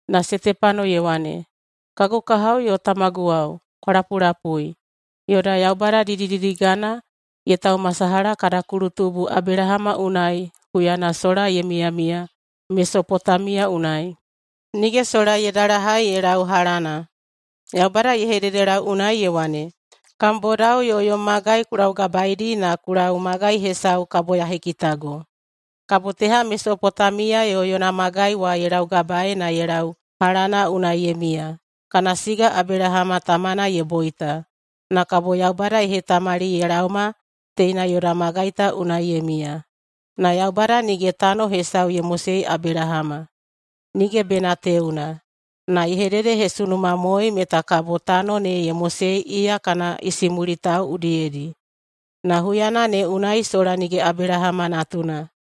Na Setepano ye wane, “Kagu kahao yo tamaguwao, kwa lapulapui. Yoda Yaubada didididigana ye taumasalaha kada kulutubu Abelahama unai huyana sola ye miyamiya Mesopotamiya unai, nige sola ye dalahai ye lau Halana. Yaubada ye hededelau unai ye wane, ‘Kam bodao yo yom magai ku laugabaedi na ku lau magai hesau kabo ya hekitago.’ Kabo teha Mesopotamiya yo yona magai wa ye laugabaei na ye lau Halana unai ye miya, kana siga Abelahama tamana ye boita. Na kabo Yaubada ye hetamali ye laoma teina yoda magai ta unai ye miya. Na Yaubada nige tano hesau ye mosei Abelahama, nige bena teuna. Na ye hededehesunumamoei meta kabo tano ne ye mosei iya yo kana isimulitao udiyedi. Na huyana ne unai sola nige Abelahama natuna.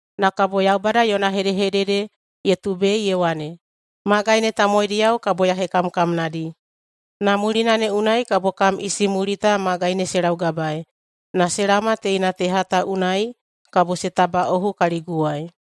Na kabo Yaubada yona hedehedede ye tubei ye wane, ‘Magai ne tamowaidiyao kabo ya hekamkamnadi, na mulina ne unai kabo kam isimulita magai ne se laugabaei na se laoma teina teha ta unai kabo se tabaꞌohu kaliguwai.’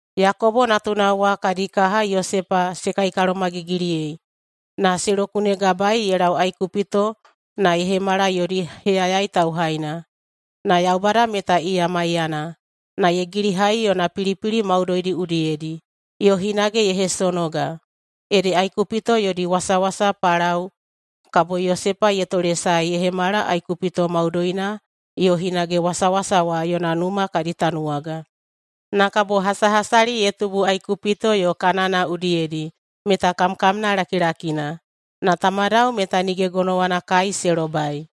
Yakobo natunao wa kadi kaha Yosepa se kaikalomagigiliyei na se lokunegabaei ye lau Aikupito na ye hemala yodi heyayai tauhaina. Na Yaubada meta iya maiyana na ye gilihai yona pilipili maudoidi udiyedi, yo hinage ye hesonoga. Ede Aikupito yodi wasawasa Palao kabo Yosepa ye tolesae ye hemala Aikupito maudoina yo hinage wasawasa wa yona numa kadi tanuwaga. Na kabo hasahasali ye tubu Aikupito yo Kanana udiyedi meta kamkamna lakilakina, na tamadao meta nige gonowana kai se lobai.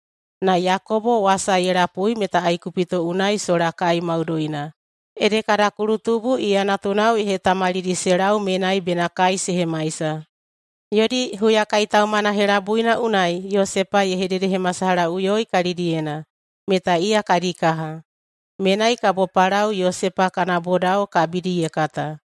Na Yakobo wasa ye lapui meta Aikupito unai sola kai maudoina, ede kada kulutubu iya natunao ye hetamalidi se lau menai bena kai se hemaisa. Yodi huyakaitaumana helabuina unai Yosepa ye hededehemasalahaꞌuyoi kalidiyena meta iya kadi kaha. Menai kabo Palao Yosepa kana bodao kabidi ye kata.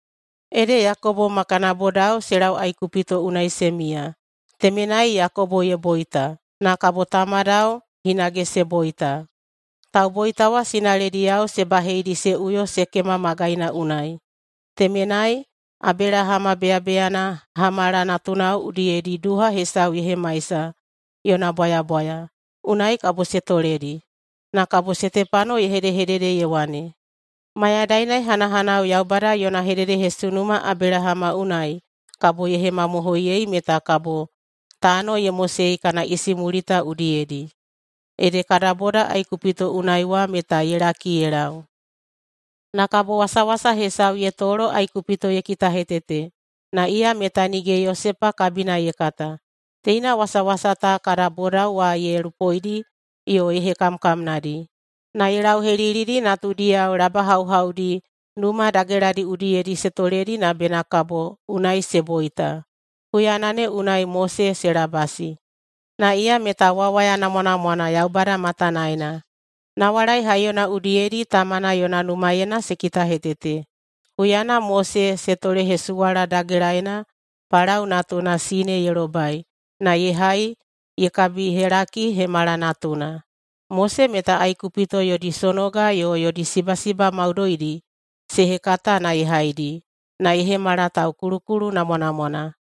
Ede Yakobo ma kana bodao se lau Aikupito unai se miya. Temenai Yakobo ye boita, na kabo tamadao hinage se boita. Tauboita wa sinalediyao se baheidi se uyo Sekema magaina unai. Temenai, Abelahama beyabeyana Hamala natunao udiyedi duha hesau ye hemaisa, yona bwayabwaya. Unai kabo se toledi.” [Na kabo Setepano ye hedehedede ye wane,] “Mayadaina ye hanahanau Yaubada yona hededehesunuma Abelahama unai kabo ye hemamohoiyei meta kabo tano ye mosei kana isimulita udiyedi, ede kada boda Aikupito unai wa meta ye laki ye lau. Na kabo wasawasa hesau ye tolo Aikupito ye kitahetete. Na iya meta nige Yosepa kabina ye kata. Teina wasawasa ta kada bodao wa ye lupoidi yo ye hekamkamnadi, na ye lauhelilidi natudiyao labahauhaudi numa dageladi udiyedi se toledi na bena kabo unai se boita. Huyana ne unai Mose se labasi, na iya meta wawaya namwanamwana Yaubada matanaena. Nawalai haiyona udiyedi tamana yona numaena se kitahetete. Huyana Mose se tolehesuwala dagelaena Palao natuna sine ye lobai na ye hai ye kabihelaki ye hemala natuna. Mose meta Aikupito yodi sonoga yo yodi sibasiba maudoidi se hekata na ye haidi, na ye hemala taukulukulu namwanamwana.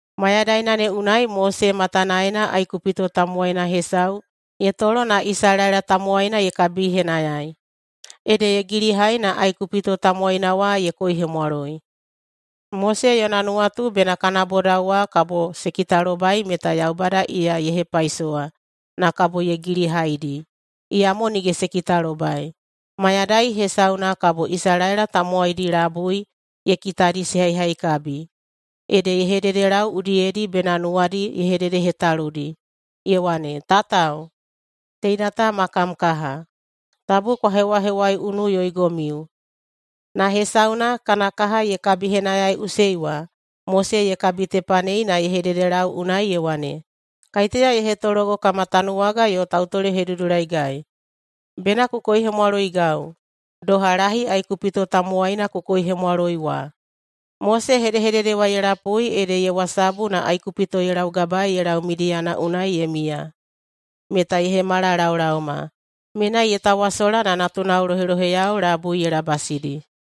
Mayadaina ne unai Mose matanaena Aikupito tamowaina hesau ye tolo na Isalaela tamowaina ye kabihenayai. Ede ye gilihai na Aikupito tamowaina wa ye koihemwaloi. Mose yona nuwatu bena kana bodao wa kabo se kitalobai meta Yaubada iya ye hepaisowa na kabo ye gilihaidi. Iyamo nige se kitalobai. Mayadai hesauna kabo Isalaela tamowaidi labui ye kitadi se haihaikabi, ede ye hededelau udiyedi bena nuwadi ye hededehetaludi ye wane, ‘Tatao, teina ta ma kam kaha. Tabu kwa hewahewaiunuꞌuyoigomiu!’ Na hesauna, kana kaha ye kabihenayaiꞌusei wa, Mose ye kabitepanei na ye hededelau unai ye wane, ‘Kaiteya ye hetologo kama tanuwaga yo tautolehedudulaigai? Bena ku koihemwaloigau, doha lahi Aikupito tamowaina ku koihemwaloi wa?’ Mose hedehedede wa ye lapui ede ye wasabu na Aikupito ye laugabaei ye lau Midiyana unai ye miya, meta ye hemala laolaoma. Menai ye tawasola na natunao loheloheyao labui ye labasidi.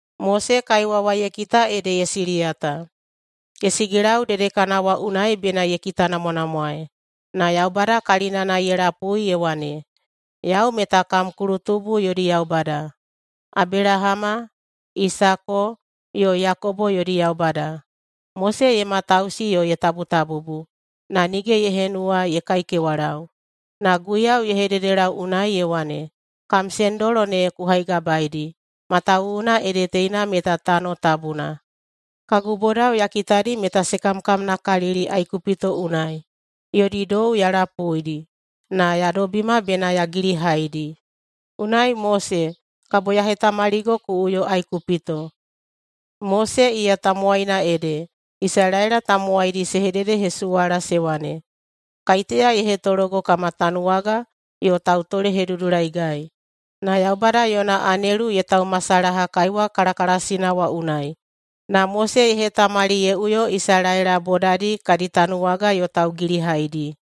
Mose kaiwa wa ye kita ede ye siliyata. Ye sigilau dedekana wa unai bena ye kitanamwanamwaei, na Yaubada kalinana ye lapui ye wane, ‘Yau meta kam kulutubu yodi Yaubada, Abelahama, Isako, yo Yakobo yodi Yaubada.’ Mose ye matausi yo ye tabutabubu, na nige ye henuwa ye kaikewalau. Na Guiyau ye hededelau unai ye wane, ‘Kam sendolo ne ku haigabaeidi, matawuwuna ede teina meta tano tabuna. Kagu bodao ya kitadi meta se kamkamnakalili Aikupito unai. Yodi dou ya lapuidi na ya dobima bena ya gilihaidi. Unai, Mose, kabo ya hetamaligo ku uyo Aikupito.’ Mose iya tamowaina ede Isalaela tamowaidi se hededehesuwala se wane, ‘Kaiteya ye hetologo kama tanuwaga yo tautolehedudulaigai?’ Na Yaubada yona anelu ye taumasalaha kaiwa kalakalasina wa unai, na Mose ye hetamali ye uyo Isalaela bodadi kadi tanuwaga yo taugilihaidi.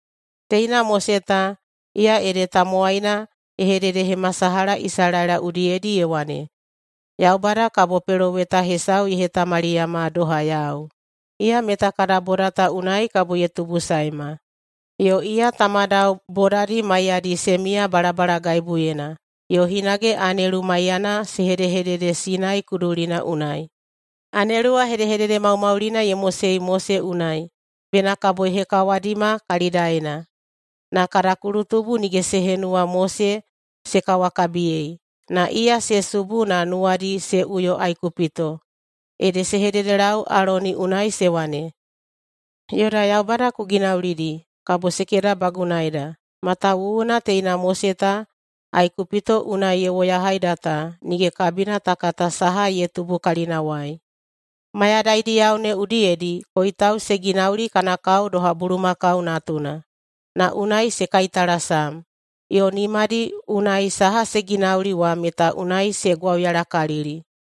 Teina Mose ta, iya ede tamowaina ye hededehemasalaha Isalaela udiyedi ye wane, ‘Yaubada kabo peloweta hesau ye hetamaliyama doha yau. Iya meta kada boda ta unai kabo ye tubusaema.’ Yo iya tamadao bodadi maiyadi se miya balabalagaibuyena, yo hinage anelu maiyana se hedehedede Sinai kudulina unai. Anelu wa hedehedede maumaulina ye mosei Mose unai bena kabo ye hekawadima kalidaena. Na kada kulutubu nige se henuwa Mose se kawakabiyei, na iya se subu na nuwadi se uyo Aikupito. Ede se hededelau Aloni unai se wane, ‘Yoda yaubada ku ginaulidi kabo se kedabagunaida, matawuwuna teina Mose ta Aikupito unai ye woyahaida ta, nige kabina ta kata saha ye tubu kalinawai.’ Mayadaidiyao ne udiyedi koitau se ginauli kana kao doha bulumakau natuna, na unai se kaitalasam, yo nimadi unai saha se ginauli wa meta unai se gwauyalakalili.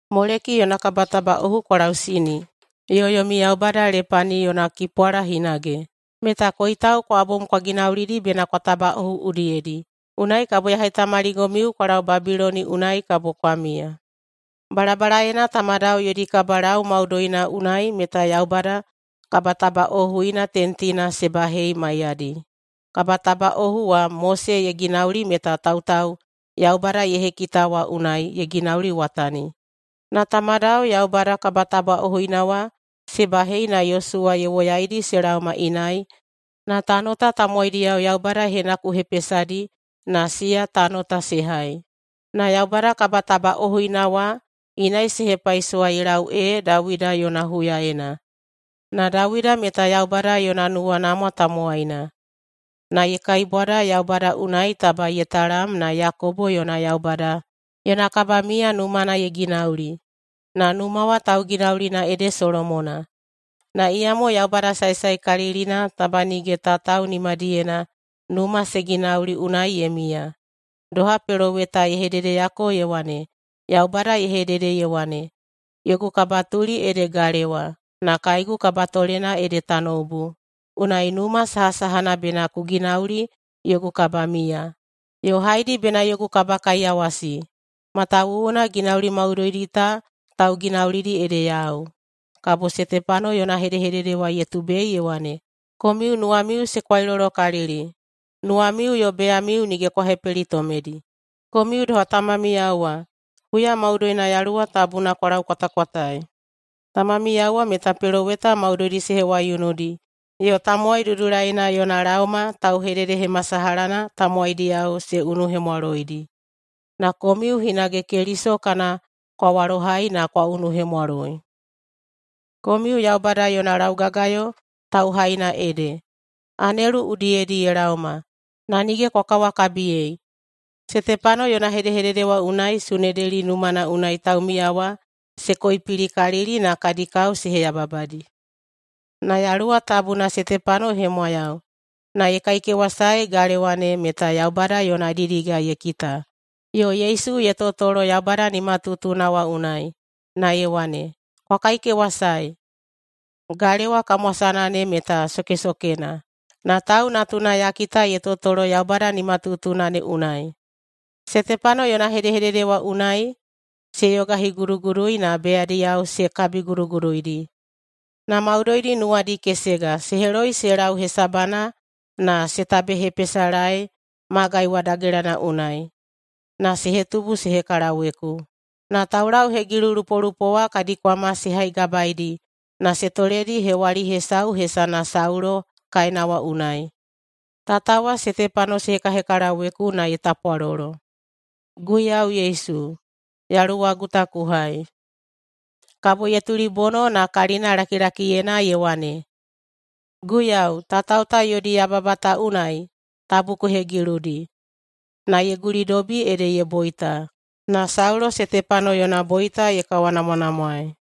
Moleki yona kabatabaꞌohu kwa lausini, yo yomi yaubada Lepani yona kipwala hinage, meta koitau kwa bom kwa ginaulidi bena kwa tabaꞌohu udiyedi. Unai kabo ya hetamaligomiu kwa lau Babiloni unai kabo kwa miya.’ Balabalaena tamadao yodi kabalau maudoina unai meta Yaubada kabatabaꞌohuina tentina se bahei maiyadi. Kabatabaꞌohu wa Mose ye ginauli meta tautau Yaubada ye hekita wa unai ye ginauliwatani. Na tamadao Yaubada kabatabaꞌohuina wa se bahei na Yosuwa ye woyaidi se laoma inai na tano ta tamowaidiyao Yaubada ye henakuhepesadi na siya tano ta se hai. Na Yaubada kabatabaꞌohuina wa inai se hepaisowa ye lau ee Dawida yona huyaena. Na Dawida meta Yaubada yona nuwanamwa tamowaina, na ye kaibwada Yaubada unai taba ye talam na Yakobo yona Yaubada yona kabamiya numana ye ginauli. Na numa wa tauginaulina ede Solomona. Na iyamo Yaubada saesaekalilina taba nige tatao nimadiyena numa se ginauli unai ye miya. Doha peloweta ye hededeyako ye wane, ‘Yaubada ye hedede ye wane, “Yogu kabatuli ede galewa, na kaegu kabatolena ede tanoubu. Unai numa sahasahana bena ku ginauli yogu kabamiya? Yo haedi bena yogu kabakaiyawasi? Matawuwuna ginauli maudoidi ta tauginaulidi ede yau.”’” [Kabo Setepano yona hedehedede wa ye tubei ye wane,] “Komiu nuwamiu se kwailolokalili! Nuwamiu yo beyamiu nige kwa hepelitomedi. Komiu doha tamamiyao wa: Huya maudoina Yaluwa Tabuna kwa laukwatakwataei. Tamamiyao wa meta peloweta maudoidi se hewaiunudi yo Tamowai Dudulaina yona laoma tauhededehemasalahana tamowaidiyao se unuhemwaloidi. Na komiu hinage Keliso kana kwa walohai na kwa unuhemwaloi. Komiu Yaubada yona laugagayo tauhaina ede. Anelu udiyedi ye laoma, na nige kwa kawakabiyei.” Setepano yona hedehedede wa unai Sunedeli numana unai taumiya wa se koipilikalili na kadi kao se heyababadi. Na Yaluwa Tabuna Setepano ye hemwayau, na ye kaikewasae galewa ne meta Yaubada yona didiga ye kita, yo Yesu ye totolo Yaubada nimatutuna wa unai. Na ye wane, “Kwa kaikewasae, galewa kamwasana ne meta sokesokena, na Tau Natuna ya kita ye totolo Yaubada nimatutuna ne unai.” Setepano yona hedehedede wa unai se yogahigudugudui na beyadiyao se kabiguduguduidi. Na maudoidi nuwadi kesega, se heloi se lau hesabana na se tabehepesalaei magai wa dagelana unai, na se hetubu se hekalaweku. Na taulauhegilulupolupo wa kadi kwama se haigabaedi na se toledi hewali hesau hesana Saulo kaena wa unai. Tatao wa Setepano se hekahekalaweku na ye tapwalolo, “Guiyau Yesu, yaluwagu ta ku hai!” Kabo ye tulibono na kalinalakilakiyena ye wane, “Guiyau, tatao ta yodi yababa ta unai tabu ku hegiludi.” Na ye gulidobi ede ye boita. Na Saulo Setepano yona boita ye kawanamwanamwaei.